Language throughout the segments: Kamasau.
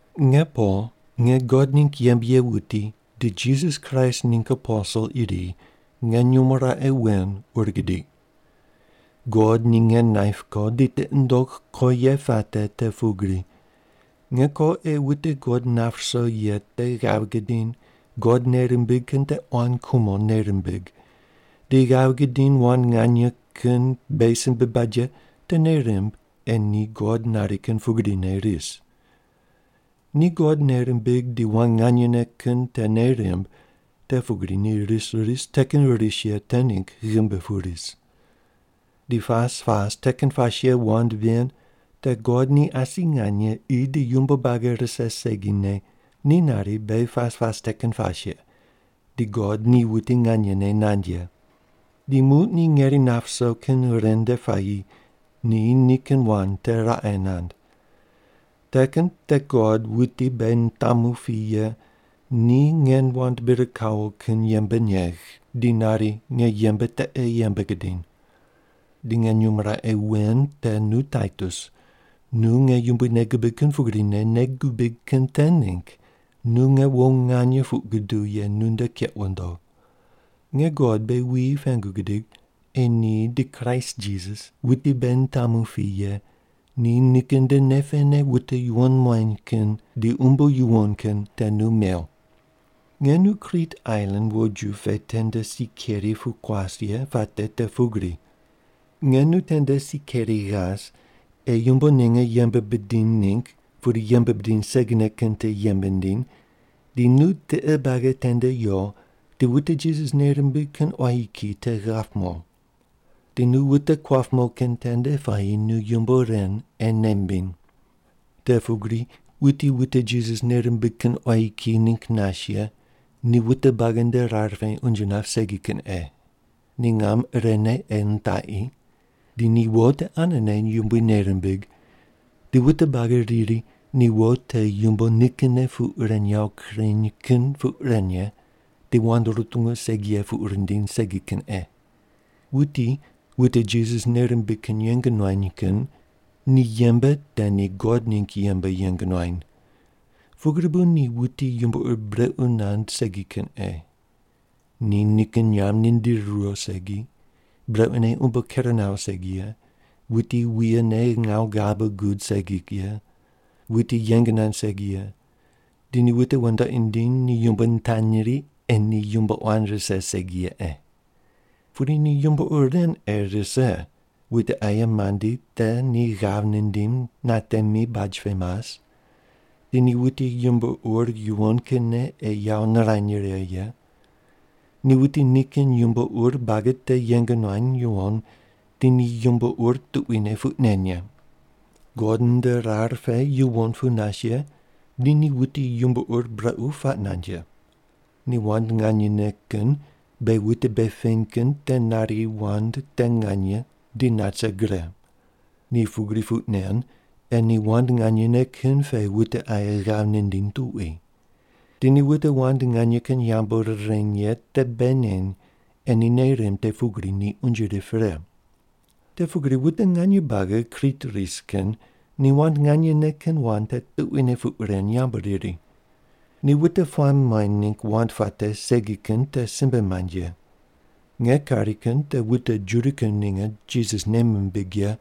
Nge Pol, nge God ningg yembe ye wuti di Jisas Kraist ningg aposel iri nge nyumo raqe wen ur gidiq. God ni nge naip ko di tiqi nundogh ko ye puate te pugri: Nge ko ei wute God nap ruso ye te ghav gidiny God nei rimbig kin te quan kumo nei rimbig, di ghav gidiny wand nganye kin beghi simbe bad ye te nei rimb ei ni God nari kin pugrine ris. Ni God nei rimbig di wand nganyene kin te nei rimb te pugri ni ris ris te kin ris ye te ningg ghimbi pu ris. Di pas pas te kin pas ye wand ven te God ni asi nganye qi di yumbo buagi rise segine ni nari beghi pas pas te kin pas ye, di God ni wuti nganyene nand ye. Di muq ni ngeri nap ruso kin ren nde puayi ni nikin wand te raqe nand. Te kin te God wuti beghi nitamu pi ye ni nge wand bir kawo kin yembe negh di nari nge yembe te ei yembe gidiny. Di nge nyumo raqe wen te nu Taitus, nu nge Yumbui nei gibig kin pugrine nei gubig kin te ningg nu nge wo nganye puq guduw ye nunde keq wundo. Nge God beghi wuyi pengu gidig ei ni di Kraist Jisas wuti beghi nitamu pi ye ni nikin nde nei pene wute yuwon muany kin di umbo yuwon kin te nu mew. Nge nu Krit ailan woju pe tende si keri pu kuas ye puate te pugri: Nge nu tende si keri ghas ei yumbo ninge yembe bidiny ningg pudi yembe bidiny segine kin te yembe ndiny, di nu tiqe buagi tende yo di wute Jisas nei rimbig kin quayi kiyi te ghap mo. Di nu wute kuap mo kin tende puayi nu yumbo ren ei nei mbiny. Te pugri, wuti wute Jisas nei rimbig kin quayi kiyi ningg nas ye ni wute buagi nde rar pe unje nap segi kin ei. Ni ngam irene ei nitaqi. Di ni wo te anene Yumbui nei rimbig, di wute buagi riri ni wo te yumbo nikinne puq ren yawo kureny kin puq ren ye di wand rutungu segi ye puq rindiny segi kin ei. Wuti wute Jisas nei rimbig kin yeng nuany kin ni yembe te ni God ningg yembe yeng nuany. Pugri bu ni wuti yumbo ur brequ nand segi kin ei. Ni nikin nyamb nindiri riwo segi, brequne umbo ker nawo segi ye, wuti wuye ne ngawu ghabe gud segi ye, wuti yeng nand segi ye, di ni wute wandoqi nindiny ni yumbo nitanyri ei ni yumbo quan rise segi ye ei. Pudi ni yumbo ur ren ei rise: Wute aye mandi te ni ghav nindim natemi baj pe mas, di ni wuti yumbo ur yuwon kinne ei yawo nirany righe ye. Ni wuti nikin yumbo ur buagi te yeng nuany yuwon di ni yumbo ur tuquine puq nen ye. God nde rar pe yuwon pu nas ye di ni wuti yumbo ur brequ puaq nand ye. Ni wand nganyene kin beghi wute bei peny kin te nari wand te nganye di nat rise gre. Ni pugri puq nen ei ni wand nganyene kin pe wute aye ghav nindiny tuqui. Di ni wute wand nganye kin yambu rireny ye te bei neny ei ni nei rimb te pugri ni unje rip pre. Te pugri wute nganye buagi Krit ris kin ni wand nganyene kin wand te tuquine puq ren yambu riri. Ni wute puamb muany ningg wand puate segi kin te simbe mand ye. Nge kari kin te wute Juda kin ninge Jisas nei mimbig ye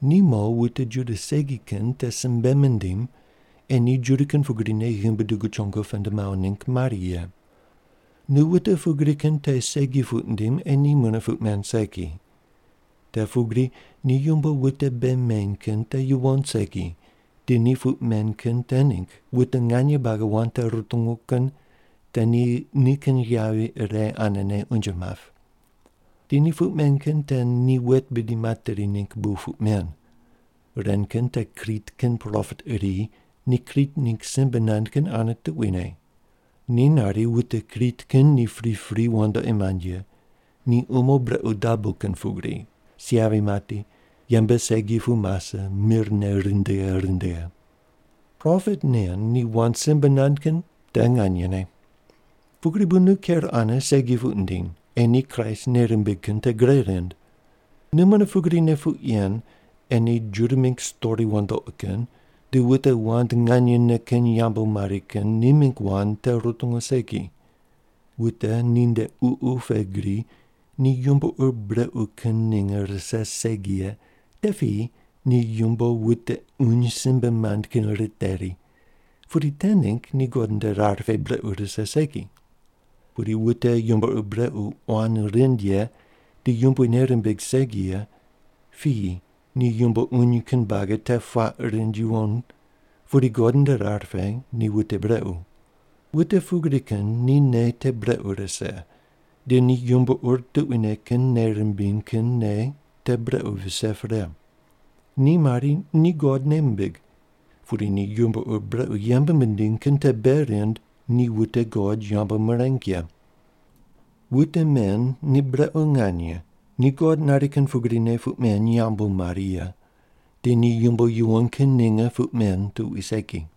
ni mo wute Juda segi kin te simbe mindim ei ni Juda kin pugrine ghimbi dugu chongo pend mawo ningg mari ye. Nu wute pugri kin te segi puq ndim ei ni mune puq men segi. Te pugri ni yumbo wute bei meny kin te yuwon segi di ni puq men kin te ningg wute nganye buagi wand te rutungu kin te ni nikin yavi ire anene unje map. Di ni puq men kin te ni wet bidi materi ningg bu puq men. Ren kin te Krit kin propet iri ni Krit ningg simbe nand kin ane tuquine. Ni nari, “Wute Krit kin ni pripri wandoqi mand ye. Ni umo brequ dabo kin pugri, si yavi mati, yembe segi pu mase mir ne rindighe rindighe.” Propet nen ni wand simbe nand kin te nganyene. Pugri bu nu ker ane segi puq ndiny ei ni Kraist nei rimbig kin te gre rind. Nu mune pugrine puq yen ei ni Juda mingg stori wandoqi kin di wute wand nganyene kin yambu mari kin ni mingg wand te rutungu segi. Wute ninde ququ pe gri ni yumbo ur brequ kin ninge rise segi ye te piyi ni yumbo wute uny simbe mand kin riteri pudi te ningg ni God nde rar pe brequ rise segi. Pudi wute yumbo ur brequ quan rind ye di Yumbui nei rimbig segi ye piyi ni yumbo uny kin buagi te puaq rind yuwon pudi God nde rar pe ni wute brequ. Wute pugri kin ni nei te brequ rise di ni yumbo ur tuquine kin nei rimbiny kin nei te brequ vise pre. Ni mari ni God nei mimbig, pudi ni yumbo ur brequ yembe mindiny kin te bei rind ni wute God yambu mireng ye. Wute men ni brequ nganye ni God nari kin pugrine puq men yambu mari ye di ni yumbo yuwon kin ninge puq men tuqui segi.